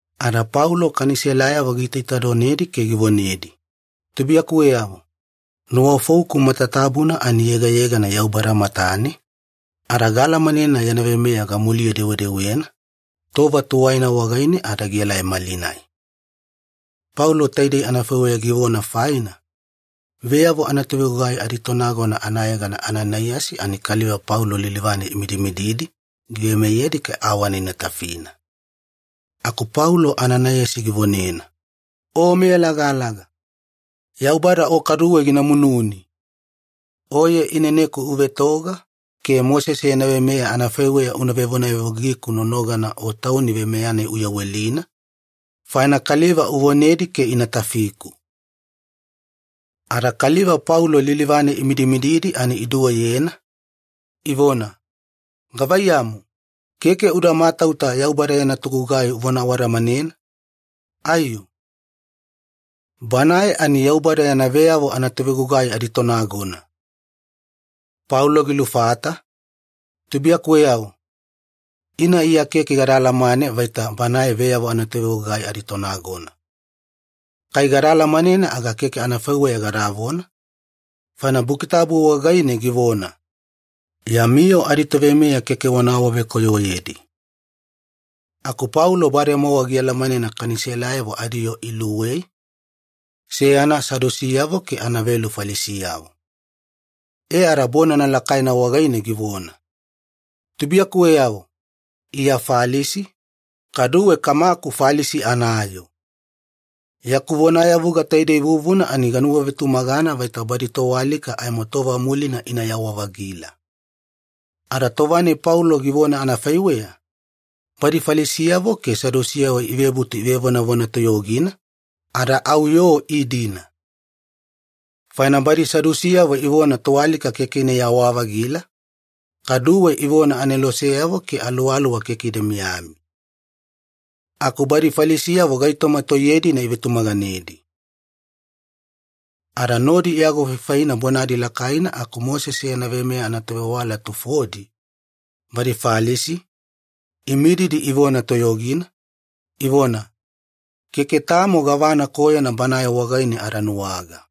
Ada Paulo Kaniselayavo giitaitadonedi ke givonedi, “Tubuiyakuweyavo, nuwafouku matatabuna ani yegayegana Yaubada matane ada gaalamanena yana veimeya gamuliye-dewedewena, tova tuwaina wagaine ada gielai malinai.” Paulo taidei anafaiweya givona faina, veyavo anatovegugai aditonagona anayegana Ananaiyasi ani kaliva Paulo lilivane imidimididi giveimeyedi ke awana ina tafina. Aku Paulo Ananaiyasi givonena, “O meyalagalaga! Yaubada o kaduwe gina mununi! Oye ineneku uvetoga ke Mosese yana veimeya anafaiweya una vevonayavugiku nonogana o tauni veimeya-nai uyawelina, faina kaliva uvonedi ke ina tafiku.” Ada kaliva Paulo lilivane imidimididi ani iduweyena, ivona, “Gavaiyamu, keke uda matauta Yaubada yana togugai unavona awadamanena, aiyo? Banae ani Yaubada yana veyavo anatovegugai aditonagona!” Paulo gilufata, “Tubuiyakuweyavo, ina Iya keke gada alamane vaita banae veyavo anatovegugai aditonagona. Kai gada alamanena aga keke anafaiweya gadavona, faina Buki Tabu wagaine givona, ‘Yami yoo aditoveimeya keke wana awavekoyoyedi.’” Aku Paulo bademowa gialamanena Kaniselayavo adiyoo iluwei, seyana Sadusiyavo ke anavelu Falisiyavo. E ada bonana lakaina wagaine givona, “Tubuiyakuweyavo, Iya Falisi, kaduwe kamaku Falisi anayoo. Yaku vonayavuga taidei vuvuna ani ganuwavetumagana vaita badi toalika aimo tova mulina inayawa-vagila.” Ada tova-nai Paulo givona anafaiweya, badi Falisiyavo ke Sadusiyavo ivebutu ivevonavona toyogina, ada au yoo iidina. Faina badi Sadusiyavo ivona toalika keke inayawa-vagila, kaduwe ivona aneloseyavo ke aluwaluwa keke ida miyami. Aku badi Falisiyavo gaitoma toiye-dina ivetumaganedi. Ada nodi iagofaifaina bonadi lakaina aku Mosese yana veimeya anatovewala tufodi, badi Falisi, imididi ivona toyogina, ivona, “Keke tamo gavana koyona banae wagaine ada nuwaga.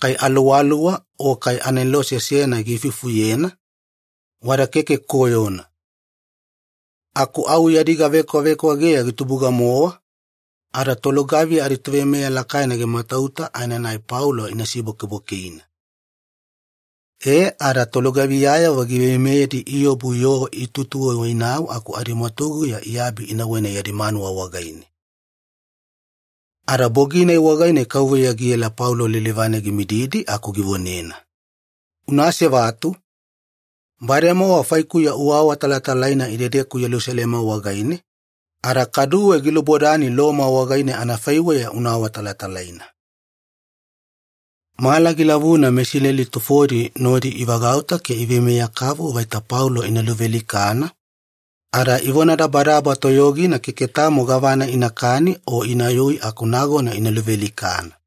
Kai aluwaluwa o kai anelose seyana giifufuyena, wada keke koyona.” Aku au yadi gavekwavekwageya gitubuga-mowa, ada tolugaviya aditoveimeya lakaina gimatauta aenanai Paulo ina sibwakeibwakeina. E ada tolugaviyayavo giveimeyedi iobu yoo iatuwaiwainau aku adimwatuguya iabi inauwena yadi manuwa wagaine. Ada bogi-nai wagaine Kauveya giela Paulo lilivane gimididi aku givonena, “Una asevatu! Bademowa faikuya uawatalatalaina idedeku Yelusalema wagaine, ada kaduwe gilubodani Loma wagaine anafaiweya una awatalatalaina.” Mala gilavuna meIsileli tufodi nodi ivagauta ke iveimeya-kavu vaita Paulo ina luvealikana, ada ivonadabadaba toyogina keke tamo gavana inakani o inayui aku nagona ina luvealikana.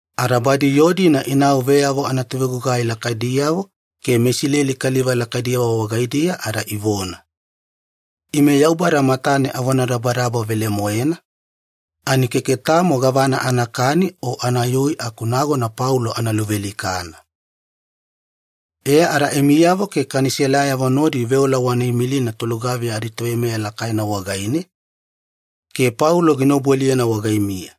Ada badi yoo-dina inau veyavo anatovegugai lakaidiyavo ke meIsileli kaliva lakaidiyavo wagaidiya ada ivona, “Ime Yaubada matane avonadabadaba velemoena, ani keke tamo gavana anakani o anayui aku nagona Paulo ana luvealikana. E ada imiyavo ke Kaniselayavo nodi veola wana imilina tolugaviya aditoveimeya lakaina wagaine, ke Paulo gina obualiyena wagaimiya.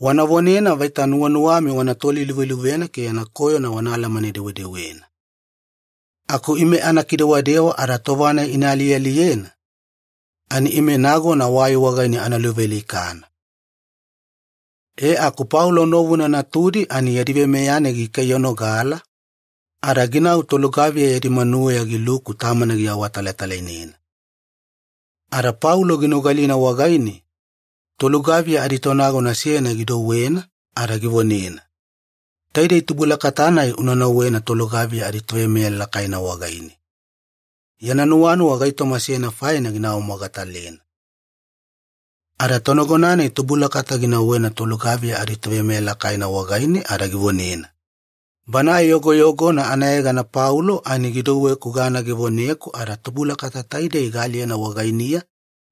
Wana vonena vaita nuwanuwami wana toliluveluvena ke yana koyona wana alamane-dewedewena. Aku ime ana kidewadewa ada tova-nai ina alialiyena, ani ime nagona wai wagaine ana luvealikana.” E aku Paulo novuna natudi ani yadi veimeya-nai gikaiyanogala, ada ginau tolugaviya yadi manuweya giluku tamana giawatalatalainena. Ada Paulo ginogalina wagaine, tolugaviya aditonagona seyana gidouwena ada givonena, “Taidei tubulakata-nai una nauwena tolugaviya aditoveimeya lakaina wagaine. Yana nuwanuwa gaitoma seyana faina gina awamogatalena.” Ada tonagona-nai tubulakata ginauwena tolugaviya aditoveimeya lakaina wagaine ada givonena, “Banae yogoyogona anayegana Paulo ani gidouweku gana givoneku ada tubulakata taidei gaaliyena wagainiya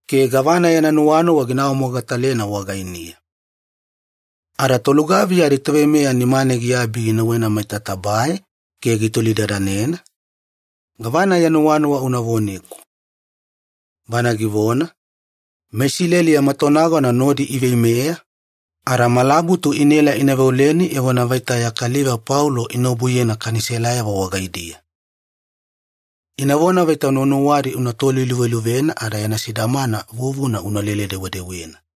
ke gavana yana nuwanuwa gina awamogatalena wagainiya.” Ada tolugaviya aditoveimeya nimane giabi ginauwena maita tabae ke gitolidadanena, “Gavana ya nuwanuwa una voneku.” Bana givona, “MeIsileli yama tonagona nodi iveimeya, ada malabutu inaela ina veoleni evona vaita ya kaliva Paulo ina obuyena Kaniselayavo wagaidiya. Inavona vaita nuwanuwadi ina toliluveluvena ada yana sidamana vuvuna inalele-dewedewena.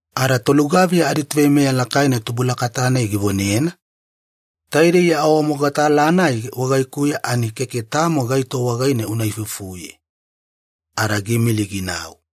Ada tolugaviya aditoveimeya lakaina tubulakata-nai givonena, “Taidei ya awamogatala-nai wagaikuya ani keke tamo gaito wagaine una ifufuye.” Ada giimili ginau.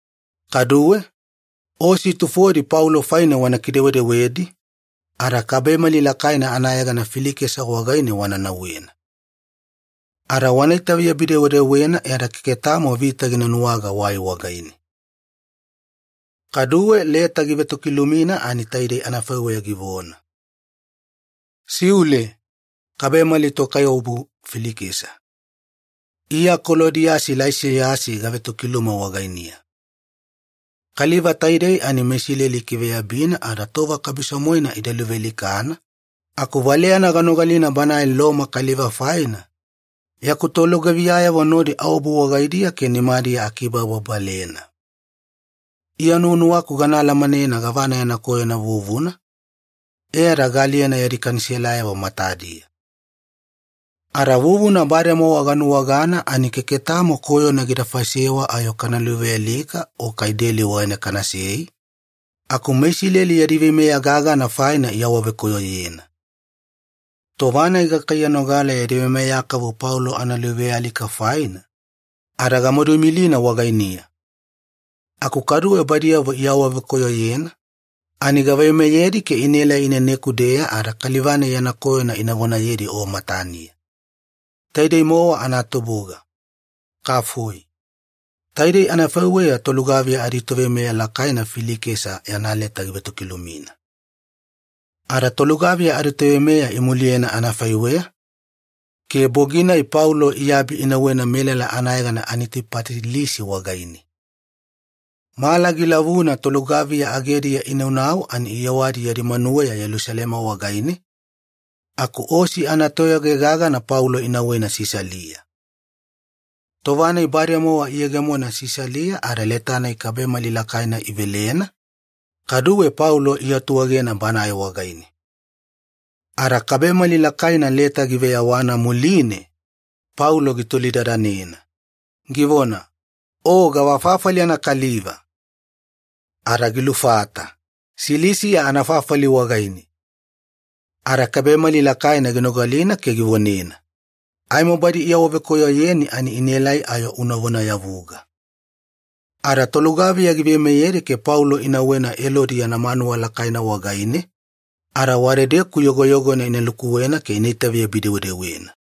Kaduwe, osi tufodi Paulo faine wana kidewedewedi, ada kabemali lakaina anayegana Filikesa wagaine wana nauwena. Ada wana itaveyabi-dewedewena e ada keke tamo vita gina nuwaga wai wagaine.” Kaduwe leta givetokilumina ani taidei anafaiweya givona. Siule, kabemali tokaiwabu Filikesa. Iya Kolodiyasi Laisiyasi gavetokiluma wagainiya. Kaliva taidei ani meIsileli ikiveyabina ada tova kabiso-moena ida luvealikana, aku valeyana ganogalina banae Loma kaliva faina, yaku tolugaviyayavo nodi aobu wagaidiya ke nimadiya akibababalena. Iya nuwanuwaku gana alamanena gavana yana koyona vuvuna, e ada gaaliyena yadi Kaniselayavo matadiya. Ada vuvuna bademowa ganuwagana ani keke tamo koyona gida faisewa ayo kana luvealika o kai deli wagaine kanasei, aku meIsileli yadi veimeya gagana faina iawavekoyoyena. Tova-nai gakaiyanogala yadi veimeya kavu Paulo analuvealika faina, ada gamadu imilina wagainiya. Aku kaduwe badiyavo iawavekoyoyena, ani gaveimeyedi ke inaelai ineneku-deya ada kaliva-nai yana koyona ina vonayedi o mataniya. Taidei-mowa anatubuga. Kafoi. Taidei anafaiweya tolugaviya aditoveimeya lakaina Filikesa yana leta givetokilumina. Ada tolugaviya adiveimeya imuliyena anafaiweya, ke bogi-nai Paulo iabi inauwena melala anayegana Anitipatilisi wagaine. Mala gilavuna tolugaviya agediya inaunau ani iyewadi yadi manuweya Yelusalema wagaine, aku osi anatoyage gagana Paulo inauwena Sisalia. Tova-nai bademowa iyegemona Sisalia ada leta-nai kabemali lakaina ivelena, kaduwe Paulo iatuegena banae wagaine. Ada kabemali lakaina leta giveyawana muline, Paulo gitolidadanena, givona, “O gavafafali anakaliva?” Ada gilufata, “Silisiya anafafali wagaine.” Ada kabemali lakaina ginogalina ke givonena, “Aimo badi iawavekoyoyeni ani inaelai ayo una vonayavuga.” Ada tolugaviya giveimeyedi ke Paulo ina nauwena Elodi yana manuwa lakaina wagaine, ada wadedeku yogoyogona ina lukuwena ke ina itaveyabi-dewedewena.